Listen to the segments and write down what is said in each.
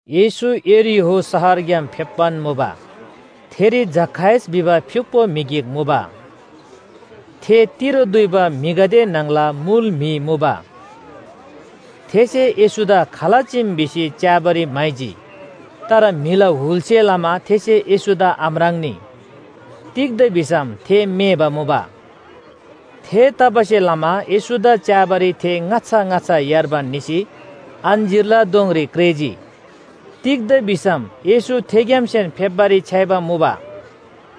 येशू यरीहो शहरग्‍याम फेप्‍बान मुबा। थेरी जखायस भिबा फ्‍युक्‍पो म्‍हि गिक मुबा। थे तिरो दुइबा म्‍हिगदे न्‍हङला मुल म्‍हि मुबा। थेसे येशूदा खाल चीम भिसी च्‍याबारी म्‍हाइजी। तर म्‍हिला हुलसे लमा थेसे येशूदा आम्राङ्‌नी। तिग्‍दा भिसम थे मेबा मुबा। थेतबासेलमा येशूदा च्‍याबारी थे ङाच्‍छा ङाच्‍छा यार्बान निसी अञ्‍जीरला दोङरी क्रेःजी। तिग्‍दा भिसम येशू थेग्‍यामसेन फेप्‍बारी छ्‌याइबा मुबा।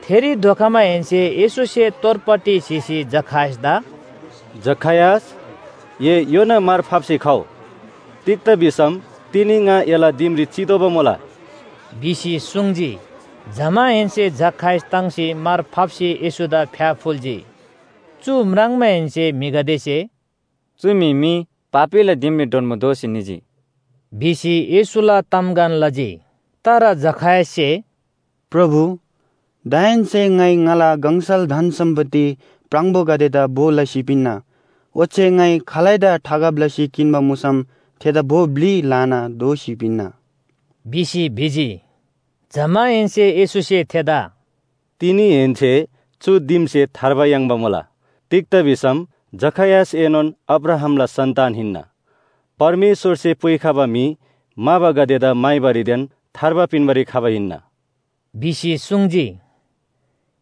थेरी धोखमाहेन्‍से येशूसे तोरपट्टि स्‍हीसी जखायसदा “जखायस, ए योना मार फाप्‍सी खउ! तिग्‍दा भिसम तिनी ङा एला दिमरी चितोःबा मुला” भिसी सुङ्जी। जमाहेन्‍से जखायस ताङ्सी मार फाप्‍सी येशूदा फ्‍याफुल्‍जी। चु म्राङ्माहेन्‍से म्‍हिगदेसे “चु म्‍हि मी पापीला दिमरी डोन्‍बो दोसी निजी” भिसी येशूला तामगन लजी। तर जखायससे “प्रभु, दाहेन्‍से ङाइ ङाला गङसल धन सम्‍पत्ति प्राङबोगदेदा भो लसी पिन्‍ना, ओच्‍छे ङाइ खालैदा ठगब लसी किन्‍बा मुसम थेदा भो ब्‍लि ल्‍हाना दोःसी पिन्‍ना” भिसी भिजी। जमाहेन्‍से येशूसे थेदा “तिनीहेन्‍से चु दिमसे थार्बा याङ्बा मुला। तिग्‍दा भिसम जखायसएनोन अब्राहामला सन्‍तान हिन्‍ना। परमेश्‍वरसे पुइखबा म्‍हि म्‍हाबागदेदा म्‍हाइबारीदेन थार्बा पिन्‍बारी खबा हिन्‍ना” भिसी सुङ्जी।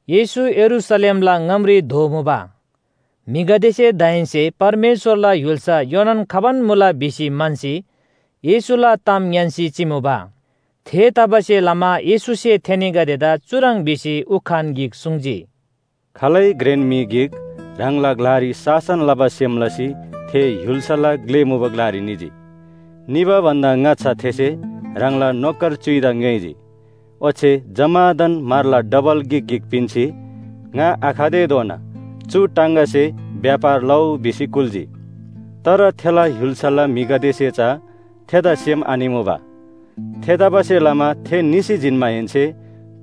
येशू यरूशलेमला ङामरी धोमुबा। म्‍हिगदेसे दाहेन्‍से परमेश्‍वरला य्‍हुल्‍सा योनान खबान मुला भिसी म्‍हन्‍सी येशूला ताम ङ्‌यान्‍सी चिमुबा। थेतबासेलमा येशूसे थेनीगदेदा चुह्रङ् भिसी उखान गिक सुङ्जी, “खालै घ्रेन म्‍हि गिक ह्राङला ग्‍लारी शासन लबा सेम लसी थे य्‍हुल्‍साला ग्‍ले मुबा ग्‍लारी निजी। निबा भन्‍दा ङाच्‍छा थेसे ह्राङला नोकर च्‍युइदा ङ्‌योइजी। ओच्‍छे जम्‍मादान म्‍हरला डबल गिक गिक पिन्‍सी ‘ङा आखतेधोना चु टाङगासे व्‍यापार लउ’ भिसी कुल्‍जी। तर थेला य्‍हुल्‍साला म्‍हिगदेसे चा थेदा सेम आनिमुबा। थेतबासेलमा थे निसी जिन्‍माहेन्‍से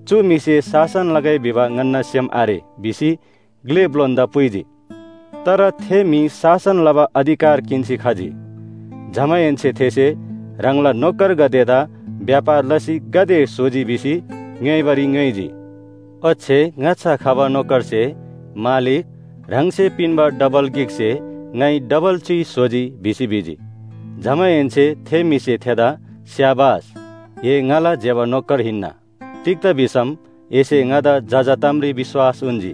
‘चु म्‍हिसे शासन लगै भिबा ङन्‍ना सेम आरे’ भिसी ग्‍ले ब्‍लोनदा पुइजी। “तर थे म्‍हि शासन लबा अधिकार किन्‍सी खजी। जमाहेन्‍से थेसे ह्राङला नोकरगदेदा व्‍यापार लसी गाते स्‍होजी भिसी ङ्‌योइबारी ङ्‌योइजी। ओच्‍छे ङाच्‍छा खबा नोकरसे ‘मालिक, ह्राङसे पिन्‍बा डबल गिकसे ङाइ डबल च्‍युइ स्‍होजी’ भिसी भिजी। जमाहेन्‍से थे म्‍हिसे थेदा ‘स्‍याबास! ए ङाला ज्‍यबा नोकर हिन्‍ना! तिग्‍दा भिसम एसे ङादा जजा तामरी विश्‍वास उन्‍जी।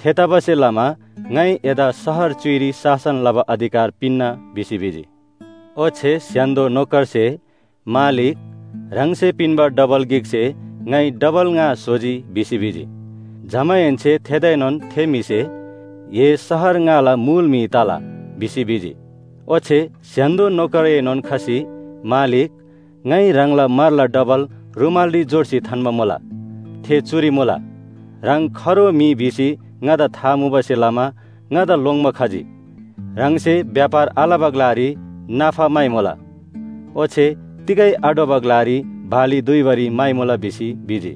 थेतबासेलमा ङाइ एदा शहर च्‍युइरी शासन लबा अधिकार पिन्‍ना’ भिसी भिजी। ओच्‍छे स्‍य्‍हान्‍दो नोकरसे ‘मालिक, ह्राङसे पिन्‍बा डबल गिकसे ङाइ डबल ङा स्‍होजी’ भिसी भिजी। जमाहेन्‍से थेदाएनोन थे म्‍हिसे ‘ए शहर ङाला मुल म्‍हि तला’ भिसी भिजी। ओच्‍छे स्‍य्‍हान्‍दो नोकरएनोन खसी ‘मालिक, ङाइ ह्राङला म्‍हरला डबल रूमालरी झोर्सी थान्‍बा मुला, थे चुरी मुला। ह्राङ खरो म्‍हि भिसी ङादा था मुबासे लमा ङादा लोङ्‌बा खजी, ह्राङसे व्‍यापार आलबा ग्‍लारी नाफा म्‍हाइमुला, ओच्‍छे तिगै आढ्‍वबा ग्‍लारी बाली दुइबारी म्‍हाइमुला’ भिसी भिजी।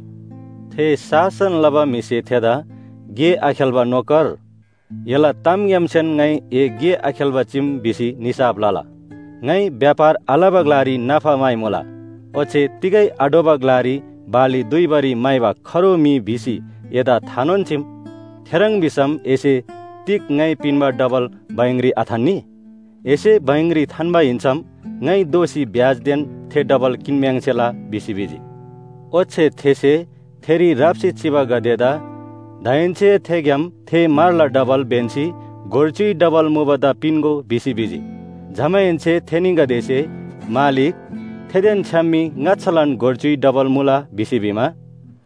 थे शासन लबा म्‍हिसे थेदा ‘गे आखेल्‍बा नोकर! एला तामग्‍यामसेन ङाइ ए गे आखेल्‍बा चीम भिसी निसाफ लला। ङाइ व्‍यापार आलबा ग्‍लारी नाफा म्‍हाइमुला ओच्‍छे तिगै आढ्‍वबा ग्‍लारी बाली दुइबारी म्‍हाइबा खरो म्‍हि भिसी एदा थानोन चीम। थेह्रङ् भिसम एसे तिग ङाइ पिन्‍बा डबल बैंकरी आथान्‍नी? एसे बैंकरी थान्‍बा हिन्‍सम ङाइ दोःसी ब्‍याजदेन थे डबल किन्‍म्‍याङ्सेला’ भिसी भिजी। ओच्‍छे थेसे थेरी राप्‍सी चिबागदेदा ‘दाहेन्‍से थेग्‍याम थे म्‍हरला डबल ब्‍यन्‍सी गोर च्‍युइ डबल मुबादा पिन्‍गो’ भिसी भिजी। जमाहेन्‍से थेनीगदेसे ‘मालिक, थेदेन छ्‌याम मी ङाच्‍छालान गोर च्‍युइ डबल मुला’ भिसी भिमा,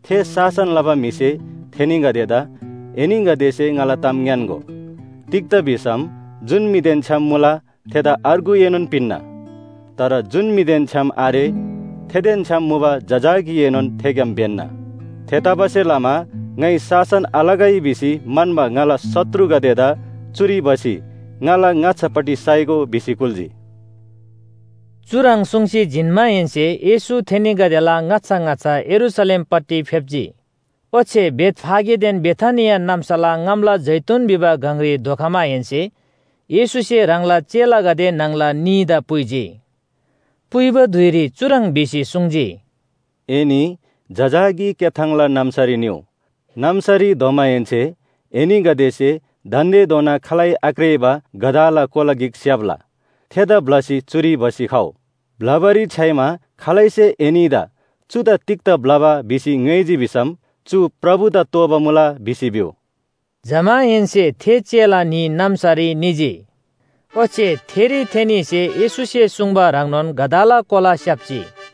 थे शासन लबा म्‍हिसे थेनीगदेदा ‘एनीगदेसे ङाला ताम ङ्‌यान्‍गो, तिग्‍दा भिसम जुन म्‍हिदेन छ्‌याम मुला थेदा अर्गुएनोन पिन्‍ना। तर जुन म्‍हिदेन छ्‌याम आरे थेदेन छ्‌याम मुबा जजाकीएनोन थेग्‍याम ब्‍यन्‍ना। थेतबासेलमा ङाइ शासन थालगै भिसी म्‍हन्‍बा ङाला शत्रुगदेदा चुरी भसी ङाला ङाच्‍छापट्टि साइगो’ भिसी कुल्‍जी।” चुह्रङ् सुङ्सी जिन्‍माहेन्‍से येशू थेनीगदेला ङाच्‍छा ङाच्‍छा यरूशलेमपट्टि फेप्‍जी। ओच्‍छे बेथफागेदेन बेथानिया नाम्‍साला ङामला जैतून भिबा गङरी धोखमाहेन्‍से येशूसे ह्राङला चेलागदे न्‍हङला न्‍हीदा पुइजी। पुइबा धुइरी चुह्रङ् भिसी सुङ्जी, “एनी जजाकी क्‍याथाङला नाम्‍सारी निउ। नाम्‍सारी धोमाहेन्‍से एनीगदेसे दान्‍देधोना खालै आक्रेःबा गधाला कोला गिक स्‍याप्‍ला। थेदा ब्‍लसी चुरी भसी खउ। ब्‍लबारी छ्‌याइमा खालैसे एनीदा ‘चुदा तिग्‍दा ब्‍लबा’ भिसी ङ्‌योइजी भिसम, ‘चु प्रभुदा तोःबा मुला’ भिसी भिउ।” जमाहेन्‍से थे चेला न्‍ही नाम्‍सारी निजी। ओच्‍छे थेरी थेनीसे येशूसे सुङ्बा ह्रङ्नोन गधाला कोला स्‍याप्‍जी।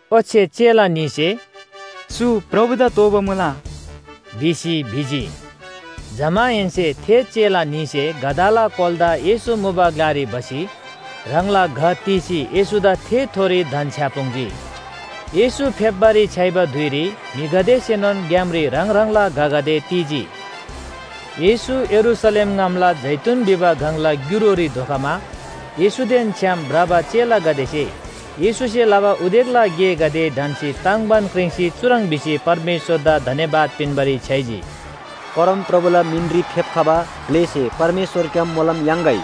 ओच्‍छे चेला न्‍हीसे “चु प्रभुदा तोःबा मुला” भिसी भिजी। जमाहेन्‍से थे चेला न्‍हीसे गधाला कोलादा येशू मुबा ग्‍लारी भसी ह्राङला घ तीसी येशूदा थेथोरी धन्‍छ्‌यापुङ्जी। येशू फेप्‍बारी छ्‌याइबा धुइरी म्‍हिगदेसेनोन ग्‍यामरी ह्राङ ह्राङला घगदे ती‍जी। येशू यरूशलेम ङामला जैतून भिबा गङला ग्‍युरोरी धोखमा येशूदेन छ्‌याम भ्रबा चेलागदेसे येशूसे लबा उदेकला गेगदे ढन्‍सी ताङ्बान क्रिङ्सी चुह्रङ् भिसी परमेश्‍वरदा धन्‍यवाद पिन्‍बारी छ्‌याइजी, “परमप्रभुला मिनरी फेप्‍खबा ग्‍लेसे परमेश्‍वरग्‍याम मोलम याङ्‌गै,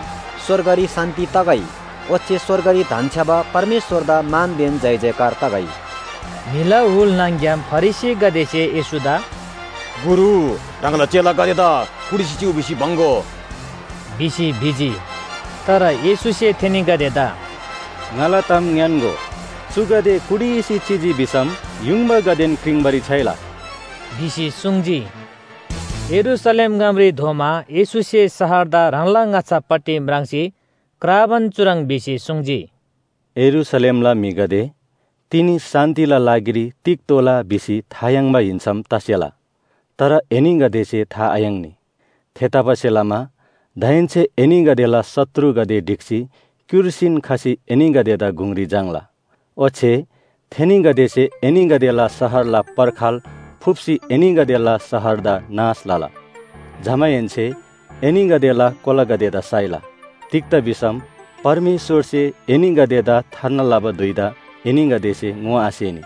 स्‍वर्गरी शान्‍ति तगै। ओच्‍छे स्‍वर्गरी धन्‍छ्‌याबा परमेश्‍वरदा मानदेन जयजयकार तगै। म्‍हिला हुल न्‍हङ‍ग्‍याम फरिसीगदेसे येशूदा “गुरु, ह्राङला चेलागदेदा कुटिसी चिउ भिसी बङ्‍‌गो” भिसी भिजी। तर येशूसे थेनीगदेदा “ङाला ताम ङ्‌यान्‍गो, चुगदे कुटिसी चिजी भिसम युङबागदेन क्रिङ्बारी छ्‌याइला” भिसी सुङ्जी। यरूशलेम ङामरी धोमा येशूसे शहरदा ह्राङला ङाच्‍छापट्टि म्राङ्सी क्राबान चुह्रङ् भिसी सुङ्जी, “यरूशलेमला म्‍हिगदे, तिनी शान्‍तिला लागिरी तिग तोःला भिसी था याङ्बा हिन्‍सम तसेला, तर एनीगदेसे था आयाङ्नी! थेतबासेलमा दाहेन्‍से एनीगदेला शत्रुगदे ढिक्‍सी क्‍युर्सीन खसी एनीगदेदा गुङरी झाङ्‌ला। ओच्‍छे थेनीगदेसे एनीगदेला शहरला पर्खाल फुप्‍सी एनीगदेला शहरदा नाश लला। जमाहेन्‍से एनीगदेला कोलागदेदा साइला। तिग्‍दा भिसम परमेश्‍वरसे एनीगदेदा थार्ना लबा धुइदा एनीगदेसे ङोआसेनी।”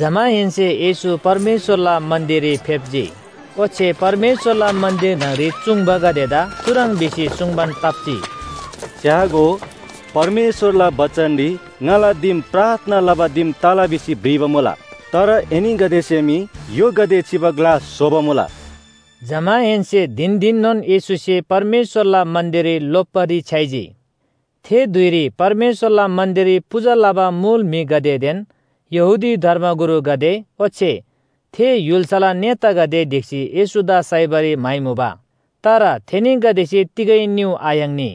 जमाहेन्‍से येशू परमेश्‍वरला मन्‍दिररी फेप्‍जी। ओच्‍छे परमेश्‍वरला मन्‍दिर न्‍हङरी चूङ्बागदेदा चुह्रङ् भिसी सुङ्बान ताप्‍जी, “च्‍यागो, परमेश्‍वरला बचनरी ‘ङाला दिम प्रार्थना लबा दिम तला’ भिसी भ्रिबा मुला। तर एनीगदेसे मी य्‍होगदे चिबा ग्‍ला स्‍होबा मुला।” जमाहेन्‍से धिन धिननोन येशूसे परमेश्‍वरला मन्‍दिररी लोप्‍बारी छ्‌याइजी। थे धुइरी परमेश्‍वरला मन्‍दिररी पूजा लबा मुल म्‍हिगदेदेन यहूदी धर्मगुरुगदे ओच्‍छे थे य्‍हुल्‍साला नेतागदे ढिक्‍सी येशूदा साइबारी म्‍हाइमुबा। तर थेनीगदेसे तिगै निउ आयाङ्नी।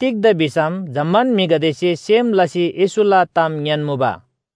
तिग्‍दा भिसम जम्‍मान म्‍हिगदेसे सेम लसी येशूला ताम ङ्‌यान्‍मुबा।